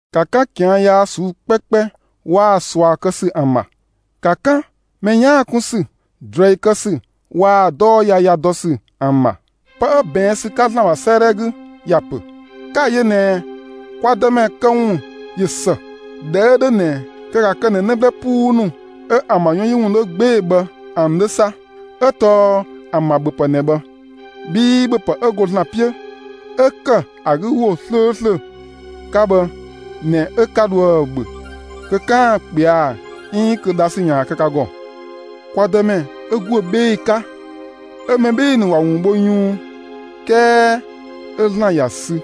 ‑Ka 'kan ꞊kian' yaa ꞊suu'‑ 'kpɛkpɛ waa‑ ꞊sua kë ‑sü ‑an ‑bha; ‑ka 'kan mɛ 'yaan‑ 'kun ‑sü, ꞊druɛi kë ‑sü waa‑ 'dɔɔ yaya dɔ ‑sü ‑nu ‑an ‑bha. Pë 'ö ꞊bɛɛn' ‑sü 'ka ‑Zlan ‑bha 'sëëdhɛ 'gü ‑ya ‑pö: 'Ka‑ yö ꞊nɛ kwa Dëmɛ këwun ꞊yö ‑së. ꞊Dhɛ 'ö 'dhö ꞊nɛ kö ‑ka kë ꞊nɛ 'në 'blë 'puu ‑nu 'ö ‑an ‑bha 'yɔn 'yi ‑wun 'dhö 'gbee‑ bhë ‑an 'dhö 'sa; 'ö tɔɔ ‑an ‑bha ‑bhöpë ꞊nɛ bhë; bhii ‑bhöpë 'ö go ‑Zlan 'piö 'ö ‑kë ‑a ‑wo 'slööslö 'ka bhë ꞊nɛ 'ö 'ka 'dhoë‑ ‑bhö kö 'kaan‑ ꞊kpɛa' 'iin kö dhasü ‑yaan kë ka ‑gɔ. Kwa Dëmɛ 'ö ‑guö 'bhee‑ 'ka 'ö mɛ 'bhee‑ ‑nu ‑wa ‑wun bho yunng, 'kɛɛ 'ö ‑Zlan ‑ya sü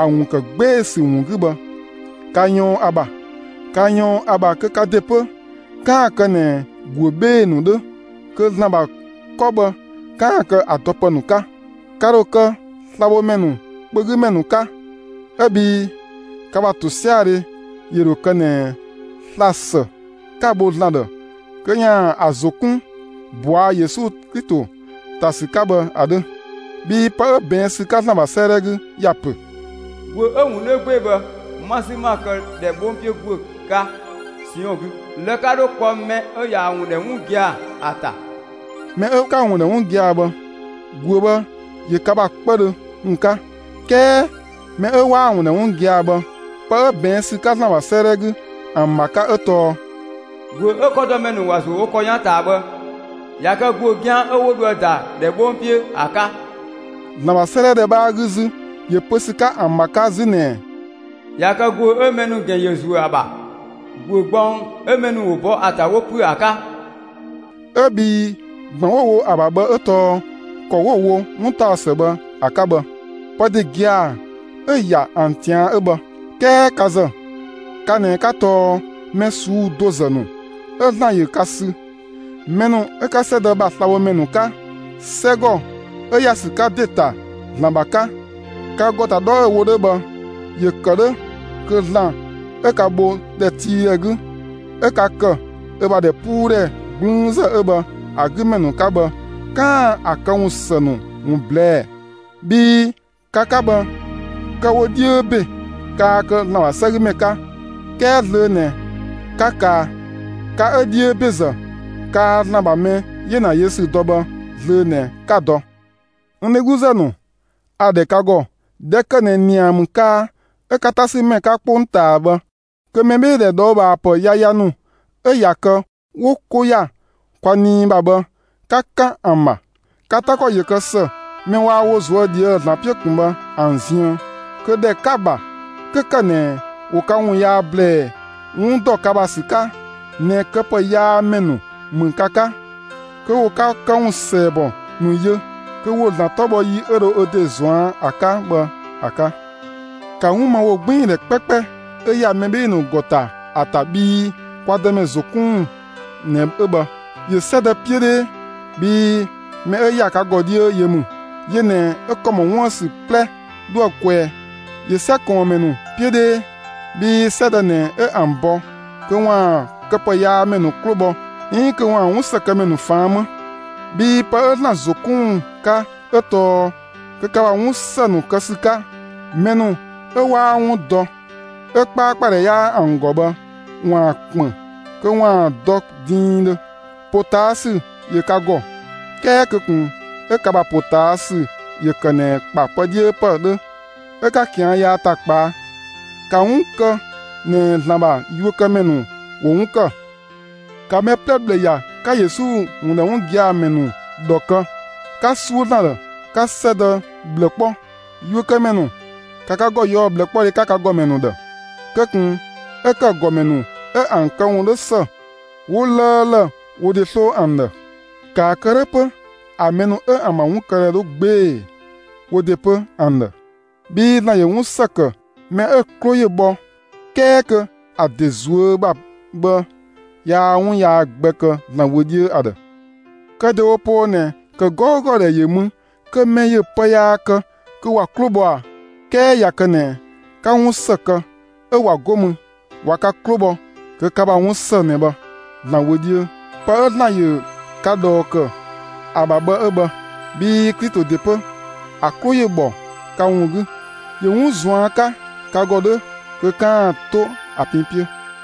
‑a ‑wun ‑kë 'gbee‑ ‑sü ‑wun 'gü bhë, ‑ka ꞊yɔɔn ‑a ‑bha. ‑Ka ꞊yɔɔn ‑a ‑bha kö ka ‑de 'pö 'kaan‑ kë ꞊nɛ ‑guö 'bhee‑ ‑nu 'dhö kö ‑Zlan ‑bha 'kɔ bhë 'kaan‑ kë ‑a dɔpë ‑nu 'ka; ka ‑dho kë slabhomɛ ‑nu kpö 'gü ‑mɛ ‑nu 'ka, 'ö bhii ka ‑bha ‑tosiadhe ‑yö ‑dho kë ꞊nɛ sla‑ ‑së 'ka‑ bho ‑Zlan ‑dhë kö ‑yaan ‑a ‑zo 'kun ꞊bɔa' Yesu Klito ‑ta ‑sü 'ka bhë ‑a 'dhö, bhii pë 'ö ꞊bɛɛn' ‑sü 'ka ‑Zlan ‑bha 'sëëdhɛ 'gü ‑ya ‑pö: ‑Guö 'ö‑ ‑wun 'dhö 'gbee‑ bhë 'ma‑ 'sü 'ma‑ këdhɛ 'bhong 'piö ‑guö 'ka Siɔn 'gü; lë‑ 'ka 'dho kpɔ mɛ 'ö ꞊yaa‑ ‑wun ‑dhɛ 'wun gia‑ ‑a ‑ta. Mɛ 'ö 'ka‑ ‑wun ‑dhɛ 'wun gia‑ bhë, ‑guö bhë ‑yö ka ‑bha 'kpëdhö ‑wun 'ka. 'Kɛɛ mɛ 'ö 'waa‑ ‑wun ‑dhɛ 'wun gia‑ bhë, (pë 'ö ꞊bɛɛn' ‑sü 'ka ‑Zlan ‑bha 'sëëdhɛ 'gü ‑an ‑bha 'ka 'ö tɔɔ:) ‑Guö 'ö 'kɔdɔmɛ ‑nu ‑wa ‑zuö wo ‑kɔ 'yan ꞊taa bhë, ꞊ya kë ‑guö 'gian 'ö 'wo dho ‑a ‑da ‑dhɛ 'bhong 'piö ‑a 'ka. ‑Zlan ‑bha 'sëëdhɛ ‑dhɛ 'bhaa 'gü 'zü ‑yö pö ‑sü 'ka ‑an ‑bha 'ka 'zü ꞊nɛ: ꞊Ya kë ‑guö 'ö mɛ ‑nu ‑gɛn ‑yö ‑zuö ‑a ‑bha, ‑guö gbɔng 'ö mɛ ‑nu ‑wo bɔ ‑a ‑ta 'wo ‑püö ‑a 'ka. 'Ö bhii ‑gban 'wo‑ wo ‑a ‑bha bhë 'ö tɔɔ ‑kɔ 'wo‑ wo 'wuntaɔsë bhë ‑a 'ka bhë; pë ‑de gia‑ 'ö ‑ya ‑an ꞊tian' 'ö bhë. 'Kɛɛ ka ‑zë ka ꞊nɛ 'ka tɔɔ mɛ ꞊suu'‑ do ‑zë ‑nu 'ö ‑Zlan ‑yö ka sü, mɛ ‑nu 'ö 'ka 'sɛdë ‑bha slabhomɛ ‑nu 'ka, 'sɛgɔ 'ö ‑ya ‑sü 'ka ‑de ‑ta ‑Zlan ‑bha 'ka. Ka ‑gɔ ‑ta 'dhɔ 'ö‑ wo 'dhö bhë, ‑yö ‑kë 'dhö kö ‑Zlan 'ö ka bho ‑dhɛtiidhɛ 'gü 'ö ka ‑kë ö ‑bha ‑dhɛpuudhɛ 'gblüünzë 'ö bhë ‑a 'gü ‑mɛ ‑nu 'ka bhë, 'kaan‑ ‑a këwun ‑së ‑nu ‑wun ꞊blɛɛ'‑; bhii ka 'ka bhë, kë‑ wo 'dhiö ‑be, kaa kë ‑Zlan ‑bha 'sɛgümɛ 'ka, 'kɛɛ zlöö ꞊nɛ 'ka kaa; ka 'ö 'dhiö ‑bezë kaa ‑Zlan ‑bha mɛ 'yena yö ‑sü dɔ bhë, zlöö ꞊nɛ 'ka‑ dɔ. N dhegluzë ‑nu, a‑ ‑dhɛ ka ‑gɔ, ꞊dhɛ ‑kë ꞊nɛ ‑nia ‑mü kaa, 'ö 'ka 'tasümɛ 'ka 'kpongtaa bhë, kö mɛbheedhe ꞊dhɔɔbhaapë yaya ‑nu 'ö ꞊ya kë 'wo 'ko ‑ya kwa nii ‑bha bhë, 'ka 'kan ‑an ‑bha! Ka 'ta ‑kɔ ‑yö kë ‑së mɛ waa wo ꞊zuö' ꞊dhië'‑ ‑Zlan 'piö ꞊kun bhë ‑an ziën, kö ‑dhɛ 'ka‑ ‑bha, 'kö ‑kë ꞊nɛ ‑wo ka ‑wun yaa ‑blɛɛ 'wun ‑dɔ ka ‑bha ‑sü 'ka ꞊nɛ këpëyaamɛ ‑nu ‑mü ka 'ka, kö ‑wo ka këwun ‑sɛɛbɔ ‑nu yö, kö ‑wo ‑Zlan 'tɔ bhɔ yi 'ö dho ö ‑de ‑zɔn ‑a 'ka bhë ‑a 'ka. ‑Ka 'wun ma ‑wogbiindhɛ 'kpɛkpɛ 'ö ‑ya mɛ 'bhee‑ ‑nu ‑gɔ ‑ta ‑a ‑ta bhii kwa Dëmɛ ‑zo 'kun ‑wun ꞊nɛ 'ö bhë; ‑yö 'sɛdë 'piö 'dhee, bhii mɛ 'ö ‑ya ka ‑gɔ 'dhiö yö ‑mü, yö ꞊nɛ 'ö ‑kɔ ‑mɔ 'wuën‑ ‑sü 'plɛ 'dhoë‑ kwɛɛ. ‑Yö 'sɛ ꞊kɔɔnmɛ ‑nu 'piö 'dhee, bhii 'sɛdë ꞊nɛ 'ö ‑an bɔ kö ‑waan këpëyaamɛ ‑nu 'klo bhɔ 'iin kö ‑waan 'wun ‑së kë ‑mɛ ‑nu ꞊faan' 'më. Bhii pë 'ö ‑Zlan ‑zo 'kun ‑wun 'ka 'ö tɔɔ kö ka ‑bha 'wun ‑së ‑nu kë ‑sü 'ka, mɛ ‑nu 'ö 'waa 'wun dɔ, 'ö 'kpaakpadhɛ 'yaa ‑an ‑gɔ bhë ‑waan ‑kpën kö ‑waan dɔ diindhö. ‑Potaasü ‑yö ka ‑gɔ; 'kɛɛ kö ꞊kun 'ö ka ‑bha ‑potaasü ‑yö ‑kë ꞊nɛ ‑kpa pë 'dhiö ‑pë 'dhö 'ö 'ka ꞊kian' yaa ‑ta kpaa; ‑ka 'wun kë ꞊nɛ ‑Zlan ‑bha yuökëmɛ ‑nu ‑wo 'wun ‑kë. ‑Ka mɛ 'plɛ ꞊bhlë ‑ya; ‑ka Yesu ‑wun ‑dhɛ 'wun gia‑ ‑mɛ ‑nu ‑dhɔ kë; ‑ka 'suö ‑Zlan ‑dhë; 'ka 'sɛdë ꞊bhlë 'kpɔ! Yuökëmɛ ‑nu, ‑ka ka ‑gɔ ꞊yɔɔ'‑ 'wlaan‑ 'ka ka ‑gɔmɛ ‑nu ‑dhë! Kö ꞊kun 'ö ‑kë ‑gɔmɛ ‑nu 'ö ‑an këwun 'dho ‑së, 'wo 'lëëlë wo ‑de 'sloo ‑an ‑dhë; ‑kaa kë 'dhö 'pö ‑a mɛ ‑nu 'ö ‑an ‑bha 'wunkëdhɛ dhö 'gbee‑ wo ‑de 'pö ‑an ‑dhë. Bhii ‑Zlan ‑yö 'wun ‑së ‑kë mɛ 'ö‑ 'klo ‑yö bhɔ, 'kɛɛ kö ‑a ‑de ꞊zuö' ‑bha bhë, yaa 'wun yaa gbɛ kë ‑Zlan wö 'dhiö ‑a ‑dhë. Kë ‑dewo poo ꞊nɛ, ‑kë 'gɔugɔ ‑dhɛ ‑yö mü kö mɛ ‑yö pë yaa kë kö ‑wa 'klo bhɔ ꞊a? 'Kɛɛ ꞊ya kë ꞊nɛ 'ka 'wun ‑së kë 'ö ꞊wa 'go mü, ꞊wa ka 'klo bhɔ, kö ka ‑bha 'wun ‑së ꞊nɛ bhë ‑Zlan wö 'dhiö. Pë 'ö ‑Zlan ‑yö ka ꞊dhɔɔ ‑kë ‑a ‑bha bhë 'ö bhë, bhii Klito ‑de 'pö, ‑a 'klo ‑yö ‑bhɔ ka ‑wun 'gü. ‑Yö 'wun ꞊zuan' 'ka ka ‑gɔ 'dhö kö 'kaan‑ 'to ‑a pin 'piö,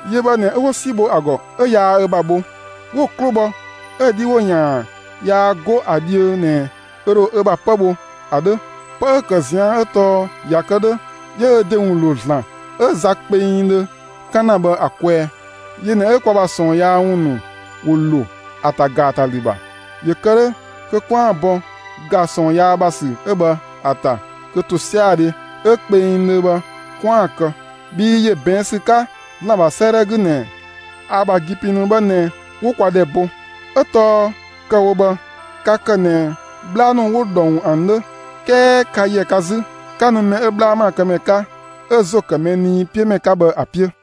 Yö bhë ꞊nɛ 'ö 'wo 'si bho ‑a ‑gɔ 'ö yaa ö ‑bha bho; 'wo‑ 'klo bhɔ, 'ö 'dhi ‑wo ‑yaan yaa 'go ‑a dhiö ꞊nɛ ö ‑dho ö ‑bha 'pë bho ‑a 'dhö. Pë 'ö‑ ‑kë ꞊zian' 'ö tɔɔ ꞊ya kë 'dhö, 'yö ö ‑de ‑wun ‑lo ‑Zlan 'ö za kpengdhö 'kan ‑na bhë ‑a kwɛɛ. Yö ꞊nɛ 'ö kwa ‑bha ꞊sɔɔnyaa ‑wun ‑nu ‑wo ‑lo ‑a ‑ta ‑gaatalü ‑bha, ‑yö kë 'dhö kö 'kwaan‑ bɔ ‑ga ꞊sɔɔn yaa ‑bha ‑sü 'ö bhë ‑a ‑ta kö ‑tosiadhe 'ö kpengdhö bhë 'kwaan‑ kë; bhii ‑yö ꞊bɛɛn' ‑sü 'ka ‑Zlan ‑bha 'sëëdhɛ 'gü ꞊nɛ: ‑A ‑bha ‑gi pin ‑nu bhë ꞊nɛ 'wo kwa ‑dhɛ bo. 'Ö tɔɔ kë‑ wo bhë, ka ‑kë ꞊nɛ 'bhla ‑nu 'wo ꞊dhɔng ‑an 'dhö; 'kɛɛ ka ‑yɛ ka 'zü 'ka nu mɛ 'ö 'bhla ‑maakëmɛ 'ka 'ö ‑zo ‑kë mɛ nii 'piö ‑mɛ 'ka bhë ‑a 'piö.